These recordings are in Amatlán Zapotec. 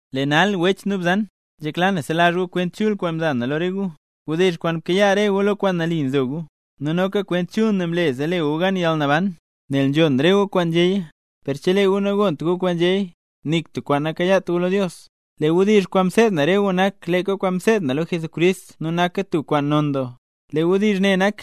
Lee nal wech nu bzan, nzhekla na selazh gu wdizh chul kwaan mza na lo re gu, wdizh kwaan mkayaa re gu, lo kwaan nali nzo gu. Nu noka Kwent Chul ne mle zee le gu gan yalnaban, nel nzhon gu re kwaan nzhéya; per chelee gu nagont gu kwaan nzhéya, nik tub kwaan nakayaat gu lo Dios. Lee wdizh kwaan mseed na re gu nak leeka kwaan mseed na lo Jesucrist nu naka tub kwaan non doo. Lee wdizh ne nak: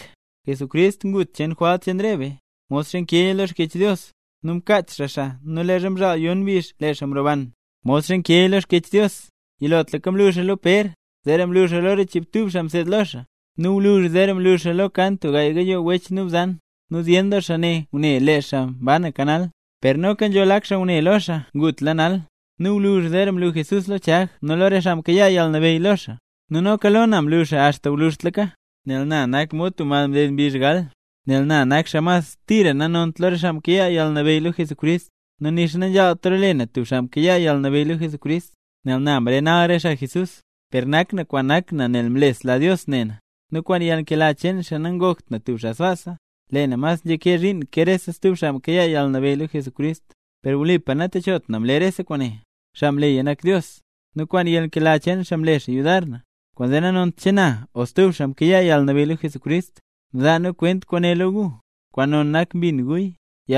Jesucrist ngut kwent cheen jwalt cheen re be, modxa nkeeya lo Xkyech Dios; nu mkaach xaa xaa nu leezha mzhaal yon mbizh lee xaa mroban, modxa nkeeya lo Xkyech Dios; yilotlaka mlu xaa lo Pér, zeera mlu xaa lo re xchiibtub xaa mseed lo xaa. Nu gwluzh zeera mlu xaa lo kan tub gaay gayoo wech nu bzan, nu zyen doo xaa ne ngune lee xaa mbanaka nal, per noka nzho lak xaa ngune lo xaa ngutla nal. Nu gwluzh zeera mlu Jesús lo Chag nu lo re xaa mkayaa yalnabeyy lo xaa. Nu noka lo na mlu xaa axta gwluzhtlaka, nel na nak mod tub mad mded mbizh gal. Nel na nak xaa mas tira nanont lo re xaa mkayaa yalnabeyy lo Jesucrist, nu nixa nanzhaalt role na tub xaa mkayaa yalnabeyy lo Jesucrist, nel na mrenal re xaa Jesús. Per nak na kwaan nak na nel mlesla Dios ne na, nu kwaan yalnkela cheen xaa nangokt na tub xaa sbaasa. Lee na mas nzhakee zhiin ke rese stub xaa mkayaa yalnabeyy lo Jesucrist, per wlipa natechot na mle rese kwaane, xaa mleya nak Dios, nu kwaan yalnkela cheen xaa mle xaa yudar na. Kwaanzee nanont che naya o che stub xaa mkayaa yalnabeyy lo Jesucrist, mzaa nu kwent kwaane lo gu, kwaan non nak mbin guya.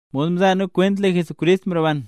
Mod mzaa nu kwent, lee Jesucrist mroban.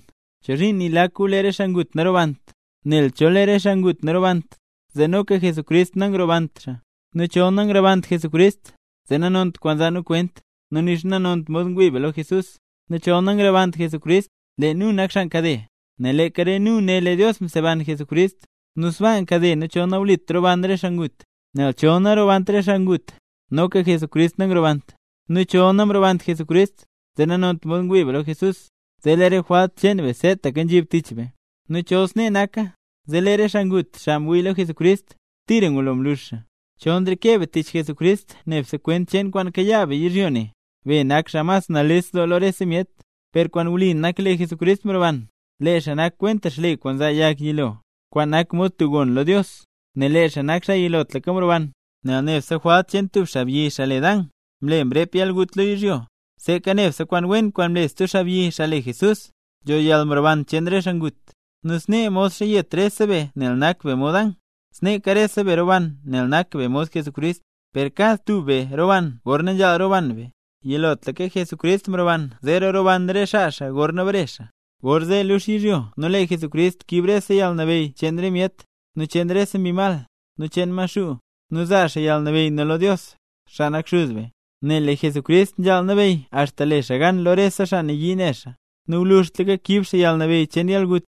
¿Chozhiin nii lak gu lee re xaa ngut narobant? Nel chol lee re xaa ngut narobant, zee noka Jesucrist nangrobant xaa. Nu chol nangrobant Jesucrist, zee nanont kwaan nzaa nu kwent, nu nixa nanont mod ngwii be lo Jesús. Nu chol nangrobant Jesucrist, lee nu nak xaa nkade, nel leeka re nu né lee Dios mseban Jesucrist. Nu sbaa nkade nu chol nawlit roban re xaa ngut. Nel chol narobant re xaa ngut, noka Jesucrist nangrobant; nu chol namrobant Jesucrist, zee nanont mod ngwii be lo Jesús, zee lee re jwalt cheen be seetaka nzhib tich be. Nu chol snee naka, zee lee re xaa ngut, xaa mwii lo Jesucrist, tira ngulo mlux xaa. Chol nreke be tich Jesucrist nebse kwent cheen kwaan kayaa be yizhyo ne, be nak xaa mas nales doo lo rese myet. Per kwaan wli nak lee Jesucrist mroban. Lee xaa nak kwenta xle kwaan nzaa yag yilo, kwaan nak mod tub gon lo Dios; nel lee xaa nak xaa yilotlaka mroban. Nel nebse jwalt cheen tub xaabyi, xaa le Dan, mle mrep yalgut lo yizhyo; sneeka nebse kwaan wen kwaan mle stub xaabyi, xaa le Jesús, nzho yalmroban cheen re xaa ngut. Nu snee modxa yet rese be nel nak be mod Dan, sneeka rese be roban nel nak be mod Jesucrist. Per kad tub be roban gorna nzhaal roban be; yilotlaka Jesucrist mroban zeera roban re xaa xaa gorna bare xaa. Gorzee lux yizhyo nu lee Jesucrist kiib rese yalnabeyy cheen re myet, nu cheen rese mbi mal, nu cheen Maxuu, nu zaa xaa yalnabeyy ne lo Dios, xaa nak Xuz be. Nel lee Jesucrist nzhaal nabeyy axta le xaa gan lo rese xaa nayii ne xaa, nu gwluzhtlaka kiib xaa yalnabeyy cheen yalgut.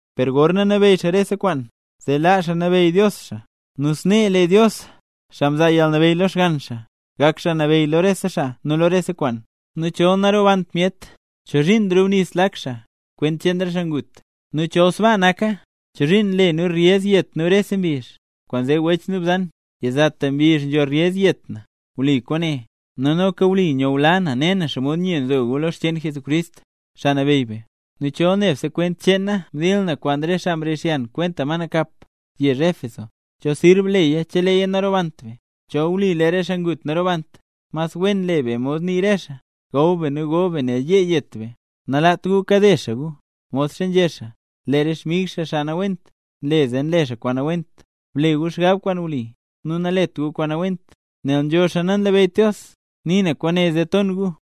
Per gorna nabeyy xaa rese kwaan, zee laa xaa nabeyy Dios xaa. Nu snee lee Dios, xaa mzaa yalnabeyy lo Xgann xaa, gak Xaa Nabeyy lo rese xaa nu lo rese kwaan. Nu chol narobant myet, ¿chozhiin nrubnis lak xaa, kwent cheen re xaa ngut? Nu chol sbaa naka, ¿chozhiin nle nu reyez yet nu rese mbizh? Kwaanzee wech nu bzan, yizata mbizh nzho reyez yet na. Wli kwaane, nu noka wli nyula na ne na xomod nye nzo gu lo xcheen Jesucrist, Xaa Nabeyy be. Nu chol nebse kwent cheen na mdil na kwaan re xaa mrixyan kwenta ma nakap, yezh Éfeso, ¿cho sirb leya cheleeya narobant be? Chol wli lee re xaa ngut narobant, mas wen le be mod nii re xaa: “¡Gaw be nu go be nel yee yet be!” Nalaat gu kade xaa gu. Modxa nzhé xaa: “Lee re xmig xaa nawent, nle zee nle xaa kwaan nawent”. Ble gu xgab kwaan wli, nu nalet gu kwaan nawent, nel nzho xaa nanlabeyyt Dios. Nii na kwaane zee ton gu.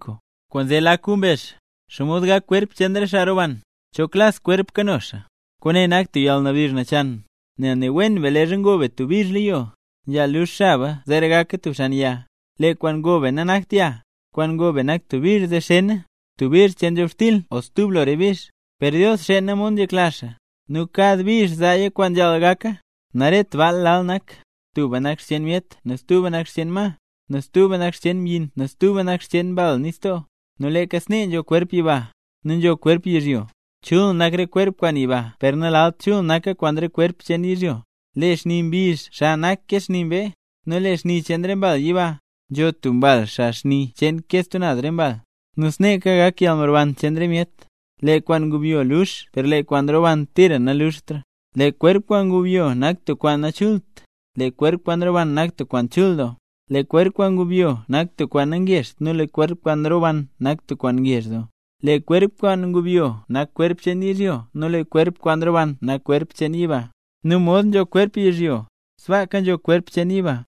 Kwaanzee lak gu mbezh: “¿Xomod gak kwerp cheen re xaa roban? ¿Cho klas kwerp kano xaa?” Kwaane nak tub yalnabdizh nachan, nel ne wen be leezha ngo be tub bizh lo yo, nzhaal lux xaba zeera gaka tub xan yag. Lee kwaan ngo be nanakt yag, kwaan ngo be nak tub bizh zee xena, tub bizh cheen nzhobxtil o stub lo re bizh. Per Dios xeena mod nzhekla xaa, nu kad bizh zaa yag kwaan nzhaal gaka. Naret baal lal nak, tuba nak xcheen myet stuba nak xcheen ma, nu stuba nak xcheen mbyin nu stuba nak xcheen mbal nistoo. Nu leeka snee nzho kwerp naz yiba, nu noka nzho kwerp yizhyo. Chul nak re kwerp kwaan yiba per nalalt chul naka kwaan re kwerp cheen yizhyo. Lee xni mbizh xa nak ke xni mbee, nu ke xni cheen re mbal yiba; nzho tub mbal xa xni cheen ke re stub naz mbal. Nu sneeka gak yalmroban cheen re myet. Lee kwaan nyubyo lux per lee kwaan roban tira nanluxtra. Lee kwerp kwaan ngubyo nak tub kwaan nachult, lee kwerp kwaan roban nak tub kwaan chul doo. Lee kwerp kwaan ngubyo nak tub kwaan nangezht nu lee kwerp kwaan roban nak tub kwaan ngezh doo. Lee kwerp kwaan ngubyo nak kwerp cheen yizhyo nu lee kwerp kwaan roban nak kwerp cheen yiba. Nu mod nzho kwerp cheen yizhyo, sbaaka nzho kwerp cheen yiba.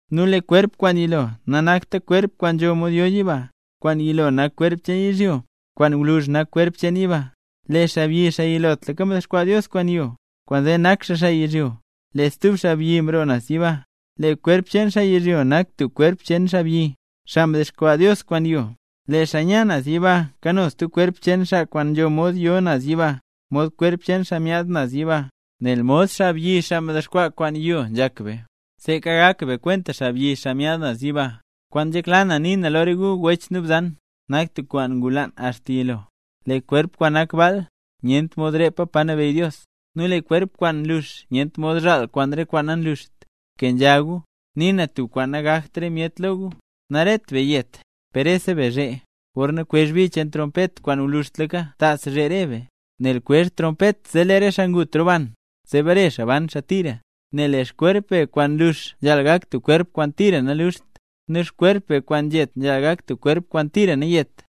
Nu lee kwerp kwaan yilo nanakt kwerp kwaan nzho mod yo yiba, kwaan yilo nak kwerp cheen yizhyo, kwaan gwluzh nak kwerp cheen yiba. Lee xaabyi, xaa yilotlaka mdexkwaa Dios kwaan yo, kwaanzee nak xaa xaa yizhyo, lee stub xaabyi mroo naz yiba. Lee kwerp cheen xaa yizhyo nak mod kwerp cheen xaabyi, xaa mdexkwaa Dios kwaan yo; lee xaa nya naz yiba kano stub kwerp cheen xaa kwaan nzho mod yo naz yiba, mod kwerp cheen xaa myaad naz yiba. Nel nzhak be mod xaabyi, xaa kwaan mdexkwaa kwaan yo, seeka gak be kwenta xaabyi, xaa myaad naz yiba. Kwaan nzhekla na nii na lo re gu wech nu bzan, nak tub kwaan ngulaan axta yilo: Lee kwerp kwaan nak baal, nyent mod repa pa nabeyy Dios, nu lee kwerp kwaan nlux nyent mod zhaal kwaan re kwaan nanluxt. ¡Bkenzha gu! Nii na tub kwaan nagakt re myet lo gu: Naret be yet, per rese be zhee. Gorna kwezh bi cheen trompet kwaan gwluzhtlaka ¡tas zhee re be! Nel kwezh trompet zee lee re xaa ngut roban, zee bare xaa ban xaa tira. Nel lee xkwerp be kwaan nlux nzhaal gak tub kwerp kwaan tira naluxt; nu xkwerp be kwaan nzhet nzhaal gak tub kwerp kwaan tira nayeta.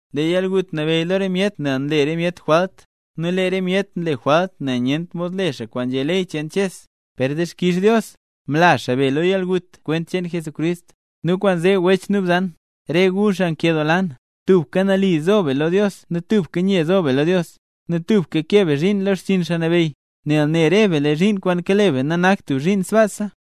Lee yalgut nabeyy lo re myet nel nle re myet jwalt, nu lee re myet nle jwalt nel nyent mod le xaa kwaan nzhé ley cheen Ches. ¡Per dixkix Dios, mla xaa be lo yalgut kwent cheen Jesucrist! Nu kwaanzee wech nu bzan, re gu xaa nkedoola na, tubka nali zo be lo Dios nu tubka nye zo be lo Dios, nu tubka kee be zhiin lo xchiin Xaa Nabeyy, nel ne re be lee zhiin kwaan kale be nanakta tub zhiin sbaasa.